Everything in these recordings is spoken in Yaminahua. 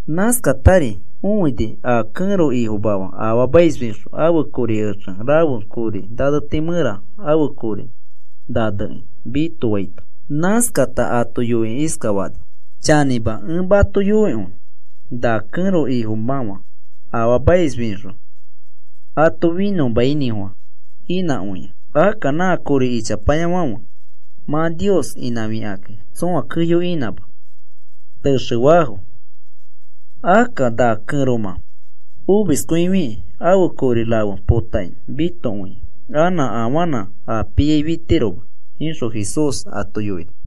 Nãskatari õini a kẽro ifomafa afaamaisfixõ ãfe kori exe rafe kori naneti mẽra ãfe kori nanekĩ mitofaito. Nãskata ato yoikĩ iskafani: “Chanĩma ẽ mato yoikõi, na kẽro ifomãfa afaamaisfixõ ato finõmainĩfofã inãkõia. Akka na kori ichapayafãfe mã Nios inãfikakĩ tsõa keyo inãma, texe faafo. Akka na kẽromã omiskõifikĩ ãfe kori rafe potakĩ mitokõia. Anã afanã a piai fitiroma,” ixõ Jesús ato yoini.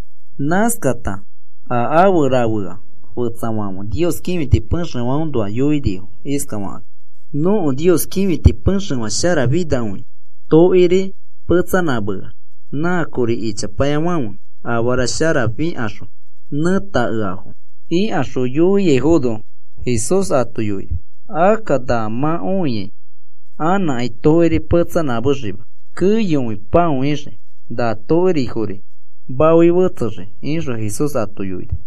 Nãskata a afe rafea fetsafãfe Nios kĩfiti pexefãõnoa yoinifo iskafakakĩ: “Nõko Nios kĩfiti pexefã sharafinakõia. Tokiri petsanãmeax nã kori ichapayafãfe afara sharafofikaxõ nẽtakeafo,” ikaxõ yoiaifono, Jesús ato yoini: “Akka na mã õiai anãkai tokiri petsanãmexima, keyokõi pãoixii. Na tokirifori maoi fetsexii,” ixõ Jesús ato yoini.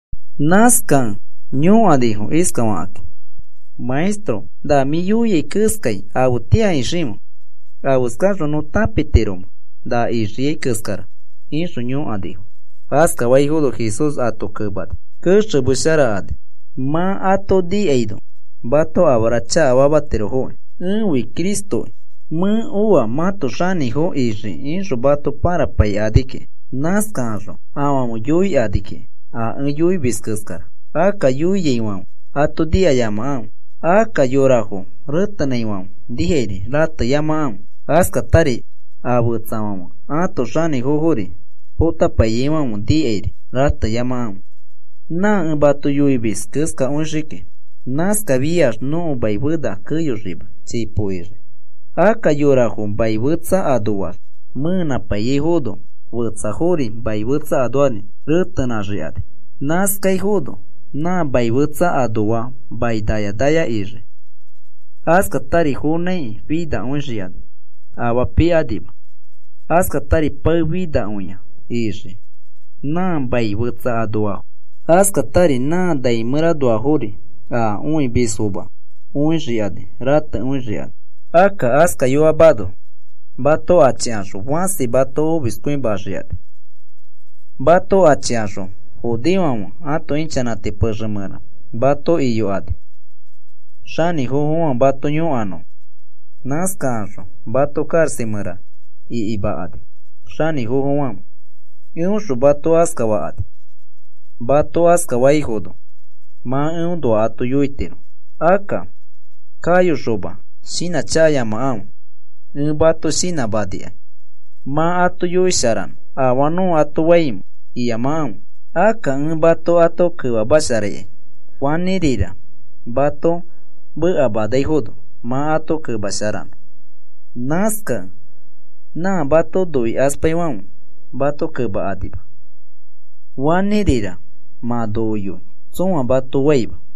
Nãskakẽ yõkanifo iskafakĩ: “Maestro, ¿na mĩ yoiai keskai afetĩa iximẽ? ¿Afeskaxõ nõ tãpitiromẽ na ixiai keskara?” ixõ yõkanifo. Askafaifono Jesús ato kemani: “Kexemesharakani mã ato nikaino mato afara chakafamatirofoki. ‘Ẽfi Cristokĩ. Mẽ oa mãto xanĩfo ixiki,’ ixõ mato pãrapaikani kiki. Nãskakaxõ afãfe yoikani kiki a ẽ yoimis keskara. Akka yoiaifãfe ato nikayamakãfe. Akka yorafo retenãifãfe nikai rateyamakãfe. Askatari a fetsafãfe ãto xanĩfofori potapaiyaifãfe nikairi rateyamakãfe. Nã ẽ mato yoimis keskakõiyoxii kiki. Nãskafiax nõko mai fena keyoxima, chipo ixii. “Akka yorafo mai fetsa anoax mẽenãpaiyaifono, yora fetsafori mai fetsa anoax retenãxikani. Nãskaifono nã mai fetsa anoafo mai naya naya ixii. Askatari fonãiki finakõixikani, afaa pikanima. Askatari pae finakõia ixii nã mai fetsa anofo. Askatari nã nai mẽranoafori a õimismafo õixikani. Ratekõixikani. “Akka askayoamano, mato achikaxõ fãsi mato omiskõimaxikani. Mato achikaxõ judeofãfe ãto ichanãti pexe mẽra mato iyokani xanĩfofofãfe mato yõkanõfo. Nãskakaxõ mato karaxa mẽra ikimakani xanĩfofofãfe. Eõxõ mato askafakani. Mato askafaifono mã eõnoa ato yoitiro. Akka kayoxoma shinãchakayamakãfe. Ẽ mato shinãmanikai mã ato yoisharanõ. Afaa nõ ato faimẽ iyamakãfe. Akka ẽ mato ato kemamasharaikai fanĩrira mato mekafaifono mã ato kemasharanõ. Nãskakẽ nã mato noikaspaifãfe mato kemakanima, fanĩrira mã noko yoi tsõa mato faima.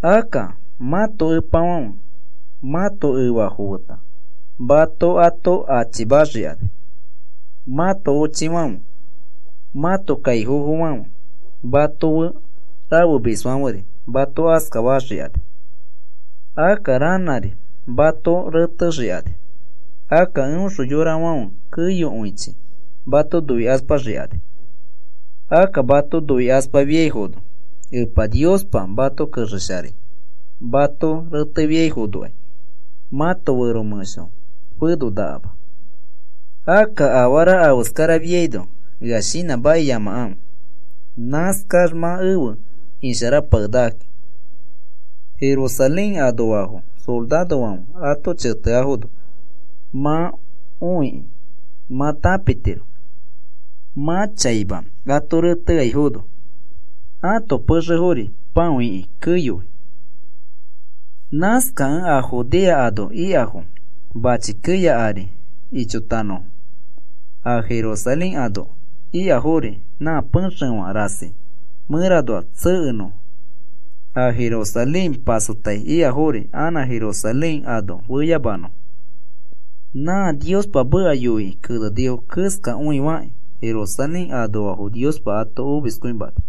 Akka mãto epafãfe mãto efafo feta mato ato achimaxikani. Mãto ochifãfe, mãto kaifofofãfe mato fe rafemisfãferi mato askafaxikani. Akka ranãri mato retexikani. Akka eõxõ yorafãfe keyokõichi mato noikaspaxikani. Akka mato noikaspafiaifono Epa Niospa mato kexesharai mato retefiaifonokai mãto fero mẽsho fenonakama. Akka afara afeskara ifiaino ea shinãmakiyamakãfe. Nãskax mã efe isharapakenakaki. “Jerusalén anoafo sorarofãfe ato cheteafono mã õikĩ mã tãpitiro mã chaima ato reteaifono, ãto pexefori pão iki keyoi. Nãskakẽ a Judea ano ikafo mãchi keya ari ichotanõfo. A Jerusalén ano ikafori nã pexefã rasi mẽranoax tsekenõfo. A Jerusalén pasotai ikafori anã Jerusalén ano feyamanõfo. Nã Niospa meka yoikĩ kenenifo keskakõi fakĩ Jerusalén anoafo Niospa ato omiskõimani.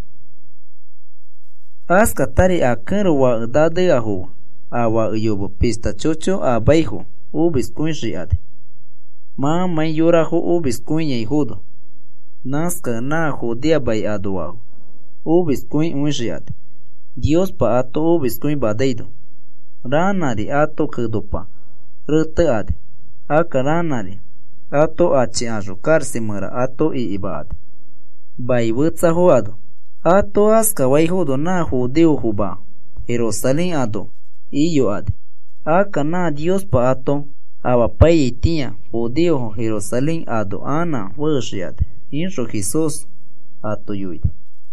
Askatari a kẽro fake naneafo fe a fake yome pishta chocho amaifo omiskõixikani mãmãi yorafo omiskõifinakõiaifono. Nãskakẽ nã Judea mai anoafo omiskõifinakõixikani, Niospa ato omiskõimanaino. Ranãri ato kenopa retekani. Akka ranãri ato achikaxõ karaxa mẽra ato ikimakani mai fetsafo ano. Ato askafaifono nã judeofoma Jerusalén ano iyokani. Akka nã Niospa ato omapaiyaitĩa judeofo Jerusalén ano anã fexikani,” ixõ Jesús ato yoini.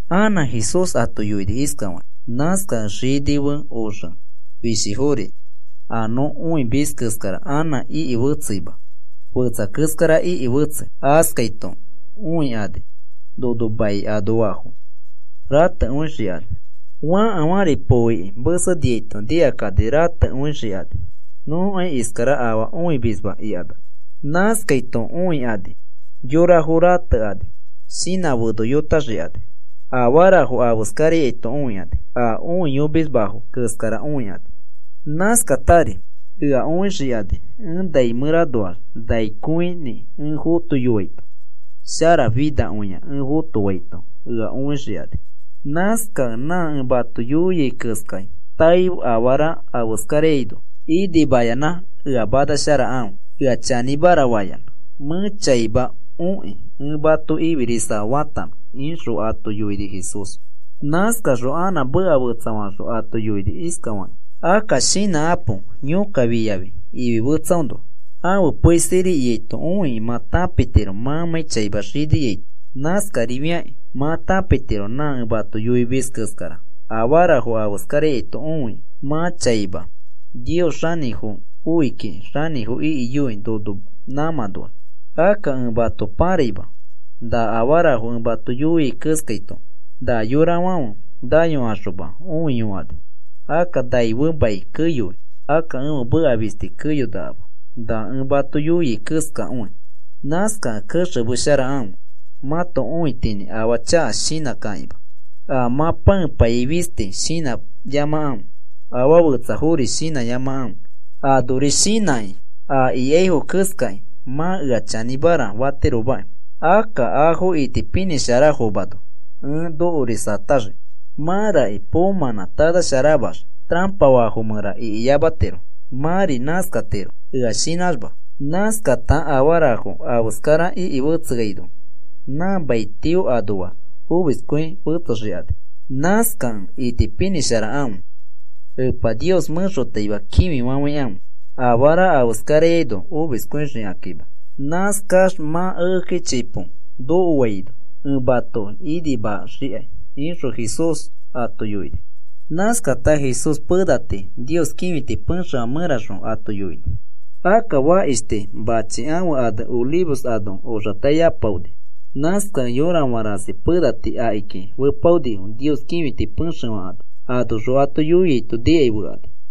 Anã Jesús ato yoini iskafakĩ: “Nãskakẽ xini fe oxe fishifori a nõ õimis keskara anã iki fetseima. Fetsa keskara iki fetsei. Askaito õikani nono mai anoafo ratekõixikani. Fãkafãri poo iki meseniaito nikakani. Ratekõixikani nõkai iskara afaa õimisma ikanax. Nãskaito õikani yorafo ratekani shinã fenoyotaxikani. Afarafo afeskaraito õikani a õiyomisfoma keskara õikani. Nãskatari ea õixikani ẽ nai mẽranoax nai kõinĩ ẽ fotoiyoaito. Shara finakõia ẽ fotoaito ea õixikani. Nãskakẽ nã ẽ mato yoiai keskai taei afarafo afeskaraino, inimayanã ea manasharakãfe, ea chanĩmara fayanã. Mẽ chaima okĩ ẽ mato ifirisa fatanõ,” ixõ ato yoini Jesús. Nãskaxõ anã meka fetsafaxõ ato yoini iskafakĩ: “Akka shinãkãpo yõkka fiyafi ifi fetsaõnoa. Ãfe pei siri ikaito õikĩ mã tãpitiro mãmãi chaima xiniaito. Nãskarifiakĩ mã tãpitiro nã ẽ mato yoimis keskara afarafo afeskaraito õikĩ mã chaima Nios Xanĩfo oi kiki xanĩfo ikiyoi nono nãmãnoax. “Akka ẽ mato pãraima. Na afarafo ẽ mato yoiai keskaito na yorafãfe nayokaxoma õiyokani. Akka nai fe mai keyoi. Akka ẽfe meka fisti keyonakama na ẽ mato yoiai keskakõi. “Nãskakẽ kexemesharakãfe mãto õitinĩ afaa chaka shinãkakĩma. A mã pãepaiyai fisti shinãyamakãfe. Afaa fetsafori shinãyamakãfe. Anori shinãkĩ a ikaifo keskakĩ mã ea chanĩmara fatiromaki. Akka afo itipinĩsharafomano ẽ nokorisataxii. Mãraki poomãnã tanasharaxma tarapa faafo mẽra ikiyamatiro. Mãri nãskatiro ea shinãxma. Nãskata afarafo afeskara iki fetseaino nã mai tio anoax omiskõi fetsexikani. Nãskakẽ itipinĩsharakãfe, Epa Nios mẽxotaima kĩfifafãikãfe afara afeskaraino omiskõixikakima. Nãskax mã ekeki chipo nokoaino ẽ matoki inimaxikai,” ixõ Jesús ato yoini. Nãskata Jesús pena tii Nios kĩfiti pexefã mẽraxõ ato yoini. Akka fakish tii machi ãfe ane Olivos ano oxatai apaoni. Nãskakẽ yorafã rasi pena tii akiki fepaonifo Nios kĩfiti pexefã ano. Anoxõ ato yoiaito nikai fekani.